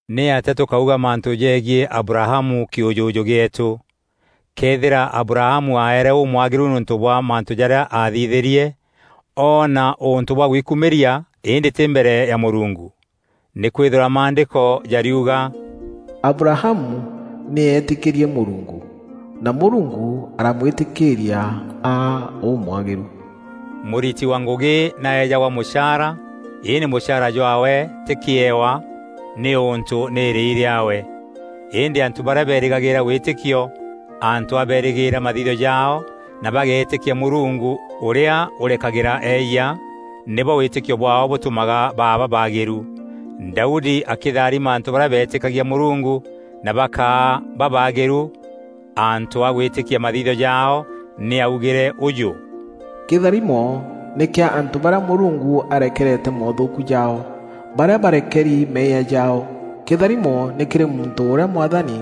Nîatîa tûkaûga mantû jegiî Abrahamu kîûjûjû gîeetû? Këethîra Abrahamu aeere ûmwagîru nîûntû bwa mantû jarîa aathithîrie, oona ûntû bwa gwikumîria îndî tî mbere ya Mûrungu. Nîkwîthîrwa Maandîko jariuga, “Abrahamu nî eetîkîrie Mûrungu, na Mûrungu aramwîtîkîîria aa ûmwagîru.” Mûriti wa ngûgî nî aeejagwa mûchaara, îndî mûchaara jwaawe tî kîewa, nîûntû nî îrîi rîaawe. Îndî antû barîa berîgagîîra wîtîkio antû a berîgîîra mathithio jaao na bageetîkia Mûrungu ûrîa ûrekagîra eeyia, nîbo wîtîkio bwaao bûtûmaga baa babaagîru. Daudi akîtharima antû barîa beetîkagia Mûrungu na bakaa babaagîru antû a gwîtîkia mathithio jaao, nî aaugîre ûûjû: “Kîtharimo nî kîa antû barîa Mûrungu arekerete moothûûku jaao, barîa barekeri meeyia jaao. Kîtharimo nî kîrî muntû ûrîa Mwathani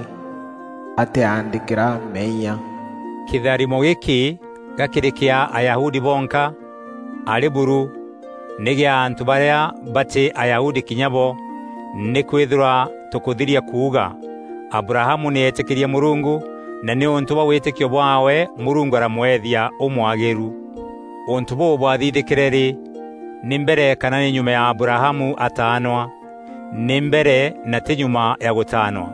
atîaandîkîra meeyia.” Kîtharimo gîkî ga kîrî kîa Ayahudi bonka? Arî buru! Nî gîa antû barîa batî Ayahudi kinya bo. Nîkwîthîrwa tûkûthiria kuuga: “Abrahamu nî eetîkîrie Mûrungu, na nîûntû bwa wîtîkio bwaawe Mûrungu aramweethia ûmwagîru.” Ûntû bûû bwathithîkîre rî? Nî mbere kana nî nyuma ya Abrahamu ataanwa? Nî mbere na tî nyuma ya agûtaanwa.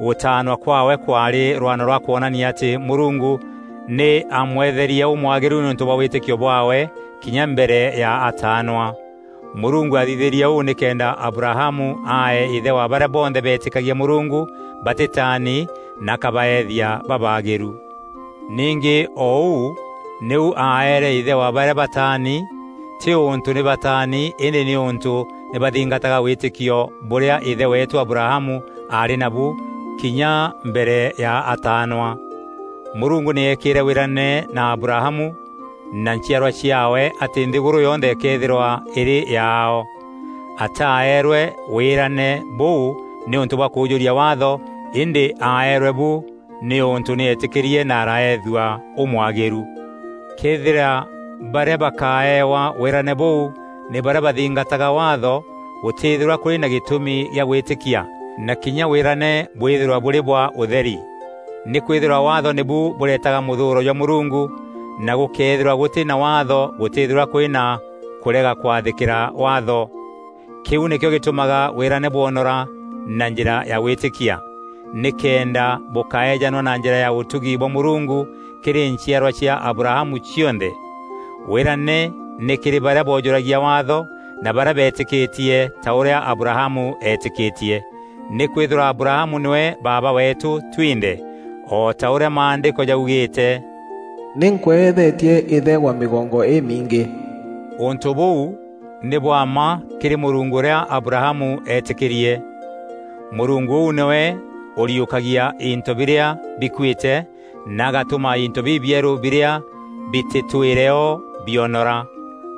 Gûtaanwa kwaawe kwaarî rwano rwa kwonania atî Mûrungu nî aamweetherie ûmwagîru nîûntû bwa wîtîkio bwaawe kinya mbere ya ataanwa. Mûrungu aathithîrie ûu nîkenda Abrahamu aa îthe wa barîa bonthe beetîkagia Mûrungu batîtaani na akabaethia babaagîru. Ningî o ûu nîu aeere îthe wa barîa bataani, tî ûntû nî bataani îndî nîûntû nî baathingataga wîtîkio bûrîa îthe weetû Abrahamu aarî nabu kinya mbere ya ataanwa. Mûrungu nî eekîîre wîrane na Abrahamu na nchiarwa ciaawe atî nthîgûrû yonthe îkeethîrwa îrî yaao. Ataeerwe wîrane bûu nîûntû bwa kûûjûria Waatho îndî aeerwe bu nîûntû nî eetîkîrie na araethua ûmwagîru. Këethîra barîa bakaewa wîrane bûû nî barîa bathingataga Waatho, gûtîîthîrwa kûrî na gîtûmi gîa gwîtîkia na kinya wîrane bwîthîrwa bûrî bwa ûtheri. Nîkwîthîrwa Waatho nîbu bûretaga mûthûûro jwa Mûrungu na gûkeethîrwa gûtî na Waatho gûtîîthîrwa kûrî na kûrega kwathîkîra Waatho. Kîu nîkîo gîtûmaga wîrane bwonora na njîra ya gwîtîkia, nîkenda bûkaejanwa na njîra ya ûtugi bwa Mûrungu kîrî nchiarwa cia Abrahamu cionthe. Wîrane nî kîrî barîa boojûragia Waatho na barîa beetîkîtie ta ûrîa Abrahamu eetîkîtie. Nîkwîthîrwa Abrahamu nîwe baaba weetû twinthe, O ta ûrîa Maandîko jaugîîte, “Nî nkweethetie îthe wa mîgongo îmingî.” Ûntû bûu nî bwa mma kîrî Mûrungu ûrîa Abrahamu eetîkîrie. Mûrungu ûu nîwe ûriûkagia into birîa bikuîte na agatûma into bibierû birîa bitîtwîre o bionora.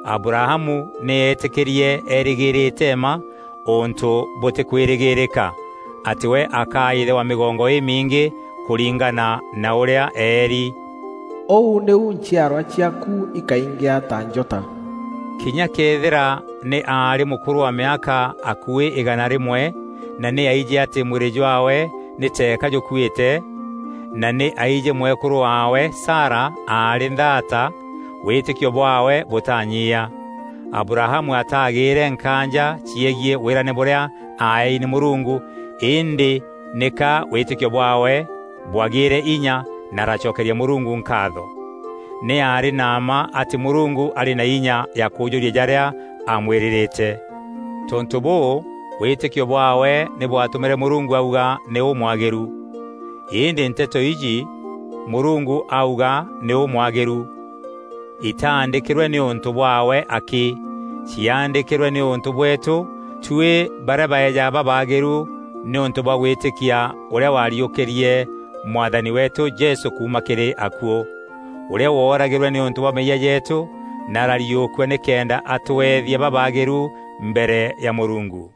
Abrahamu nî eetîkîrie eerîgîîrîte mma ûntû bûtîkwîrîgîîrîka, atî we akaa îthe wa mîgongo îmingî, kûringana na ûrîa eeri, “Ûu nîu nchiarwa ciaaku ikaingîa ta njota.” Kinya këethîra nî aarî mûkûrû wa mîaka akuî îgana rîmwe, na nî aijî atî mwîrî jwaawe nî teeka jûkuîte, na nî aijî mwekûrû waawe, Sara, aarî nthaata, wîtîkio bwaawe bûtaanyiia. Abrahamu ataagîîre nkaanja ciegiî wîrane bûrîa aaei nî Mûrungu, îndî nîka wîtîkio bwaawe bwagîîre inya na aracokeria Mûrungu nkaatho. Nî aarî na mma atî Mûrungu arî na inya ya kûûjûria jarîa aamwîrîrîte. Tontû bûû, wîtîkio bwaawe nî bwatûmîre “Mûrungu auga nî ûmwagîru.” Îndî nteto iji, “Mûrungu auga nî ûmwagîru,” itaandîkîrwe nîûntû bwaawe akî. Ciaandîkîrwe nîûntû bweetû, tuî barîa baejaga babaagîru nîûntû bwa gwîtîkia ûrîa waariûkîrie Mwathani weetû Jesû kuuma kîrî akuû, ûrîa wooragîrwe nîûntû bwa meeyia jeetû na arariûkua nîkenda atûethia babaagîru mbere ya Mûrungu.